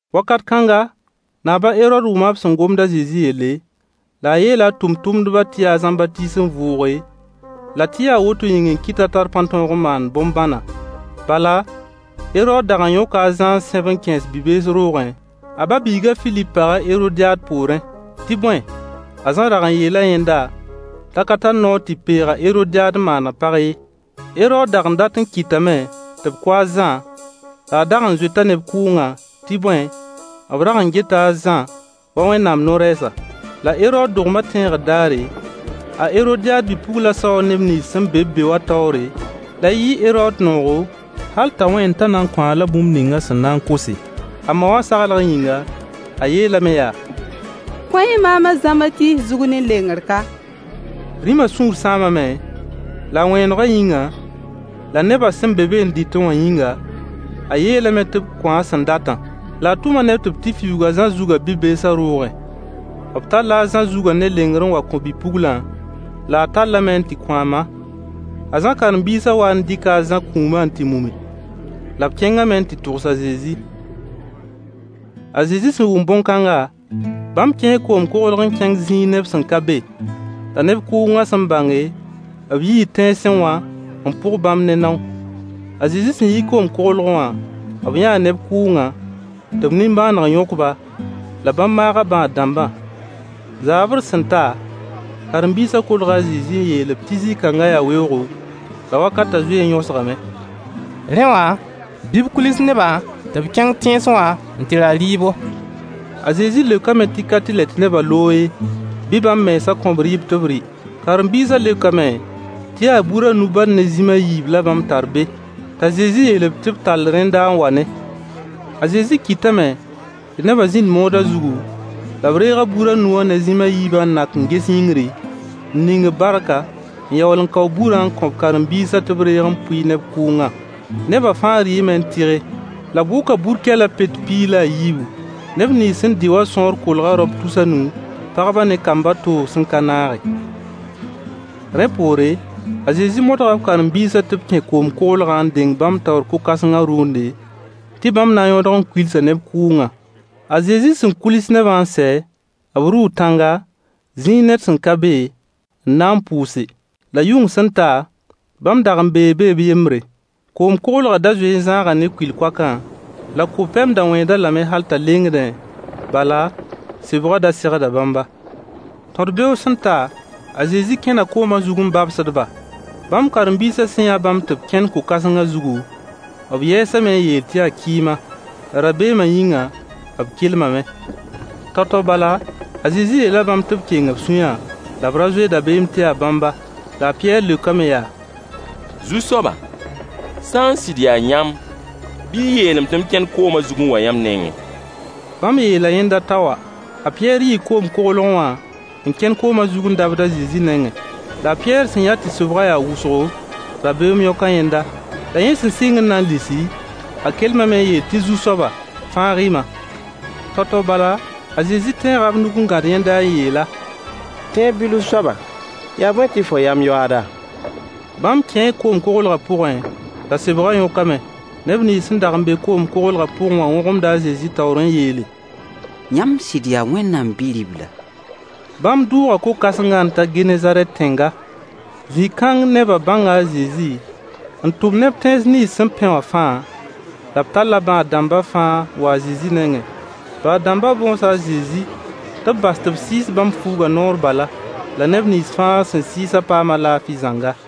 Wakat kãnga, naab a Herood wʋma b sẽn gomd a Zezi yelle, la a yeela a tʋmtʋmdbã tɩ yaa a Zãmbatiis n vʋʋge, la tɩ yaa woto yĩng n kɩt t'a tar pãn-tõog n maand bõn-bãnã. Bala Herood dag n yõka a Zã n sẽb n kẽes bi-bees roogẽ, a ba-biig a Filip pag a Herodyaad poorẽ. Tɩ bõe, a Zã rag n yeela yẽnda t'a ka tar noor tɩ peeg a Heroodyaad n maan a pag ye. Herood dag n dat n kɩtame tɩ b kʋ a Zã, la a dag n zoeta neb kʋʋngã, tɩ bõe, b rag n geta a Zã wa Wẽnnaam no-rɛɛsa. La Herood dogmã tẽegr daare, a Heroodyaad bi-puglã saoo neb nins sẽn be-b be wã taoore, la yɩɩ Herood noogo, hal t'a wẽen t'a na n kõ-a-la bũmb ning a sẽn na n kose. A ma wã saglg yĩnga, a yeelame yaa: Kõ-y maam a Zãmbatiis zug ne lengr ka. Rĩmã sũur sãamame, la a wẽenegã yĩnga, la nebã sẽn be be n dɩtẽ wã yĩnga, a yeelame tɩ b kõ-a a sẽn datã. La a tʋma neb tɩ b tɩ fiuug a Zã zugã bi-beesã roogẽ. B talla a Zã zugã ne lengr n wa n kõ bi-puglã, la a tallame n tɩ kõ a ma. A Zã karen-biisã waa n dɩka a Zã kũumã n tɩ mumi. La b kẽngame n tɩ togs a Zezi. A Zezi sẽn wʋm bõn-kãnga, bãmb kẽe koom-koglg n kẽng zĩig neb sẽn ka be. La neb kʋʋngã sẽn bãnge, b yii tẽnsẽ wã n pʋg bãmb ne nao. A Zezi sẽn yi koom-koglgẽ wã, b yãa neb kʋʋngã, tɩ b nimbãaneg yõk-ba, la bãmb maaga bãad-dãmbã. Zaabr sẽn ta, karen-biisã kolga a Zezi n yeel-b tɩ zĩ-kãngã yaa weoogo, la wakatã zoe n yõsgame. Rẽ wã, bɩ b kuils nebã tɩ b kẽng tẽnsẽ wã n tɩ ra dɩɩbo. A Zezi leokame tɩ ka tɩlɛ tɩ nebã loog ye, bɩ bãmb mensã kõ-b rɩɩb tɩ b rɩ. Karen-biisã leokame tɩ yaa bur a nu bal ne zĩm a yiib la bãmb tar be. T'a Zezi yeel-b tɩ b tall rẽnda n wa-ne. A Zezi kɩtame tɩ nebã zĩnd moodã zugu, la b reega bur a nu wã ne zĩm a yiibã n nak n ges yĩngri, n ning-b barka, n yaool n kao burã n kõ b karen-biisã tɩ b reeg n pʋɩ neb kʋʋngã. Nebã fãa rɩɩme n tɩge, la b wʋka bur-kɛlã pet piig la a yiibu. Neb nins sẽn dɩ wã sõor kolga raop tus a nu, pagbã ne kambã toog sẽn ka naage. Rẽ poore, a Zezi modga b karen-biisã tɩ b kẽ koom-koglgã n deng bãmb taoor ko-kãsengã rʋʋnde, tɩ bãmb na n yõdg n kuilsa neb kʋʋngã. A Zezi sẽn kuils nebã n sɛ, b rʋʋ tãnga, zĩig ned sẽn ka be n na n pʋʋse. La yʋng sẽn ta, bãmb dag n bee be b yembre. Koom-koglgã da zoe n zãaga ne kʋɩl-koakã, la ko-pɛm da wẽed-a lame hal t'a lengdẽ, bala, sebgã da segda bãmba. Tõd-beoog sẽn ta, a Zezi kẽna koomã zug n babsd-ba. Bãmb karen-biisã sẽn yã bãmb tɩ b kẽnd ko-kãsengã zugu, b yɛɛsame n yeel tɩ yaa kɩɩma. La rabeemã yĩnga b kelmame. Tao-tao bala a Zezi yeela bãmb tɩ b keng b sũyã la b ra zoe rabeem tɩ yaa bãmba. La a Pɩyɛɛr leokame yaa: Zu-soaba, sã n sɩd yaa yãmb bɩ y yeel-m tɩ m kẽn koomã zug n wa yãmb nengẽ. Bãmb yeela yẽnda t'a wa. A Pɩyɛɛr yii koom-koglgẽ wã n kẽn koomã zug n dabd a Zezi nengẽ. La a Pɩyɛɛr sẽn yã tɩ sebgã yaa wʋsgo, rabeem yõka yẽnda. La yẽ sẽn sɩng n na n lisi, a kelmame n yeel tɩ Zu-soaba, fãag-y-ma. Tao-tao bala, a Zezi tẽega b nug n gãd yẽnda n yeel-a: Tẽeb bilf soaba, yaa bõe tɩ fo yam yoaada? Bãmb kẽe koom-koglgã pʋgẽ la sebgã yõkame. Neb nins sẽn dag n be koom-koglgã pʋgẽ wã wõgemda a Zezi taoor n yeele: Yãmb sɩd yaa Wẽnnaam Bi-ribla. Bãmb dʋʋga ko-kãsengã n ta Genezarɛt tẽnga. Zĩ-kãng nebã bãnga a Zezi, n tʋm neb tẽns nins sẽn pẽ wã fãa, la b talla bãad-dãmbã fãa n wa a Zezi nengẽ. Bãad-dãmbã bõosa a Zezi tɩ b bas tɩ b sɩɩs bãmb fuugã noor bala. La neb nins fãa sẽn sɩɩsã paama laafɩ zãnga.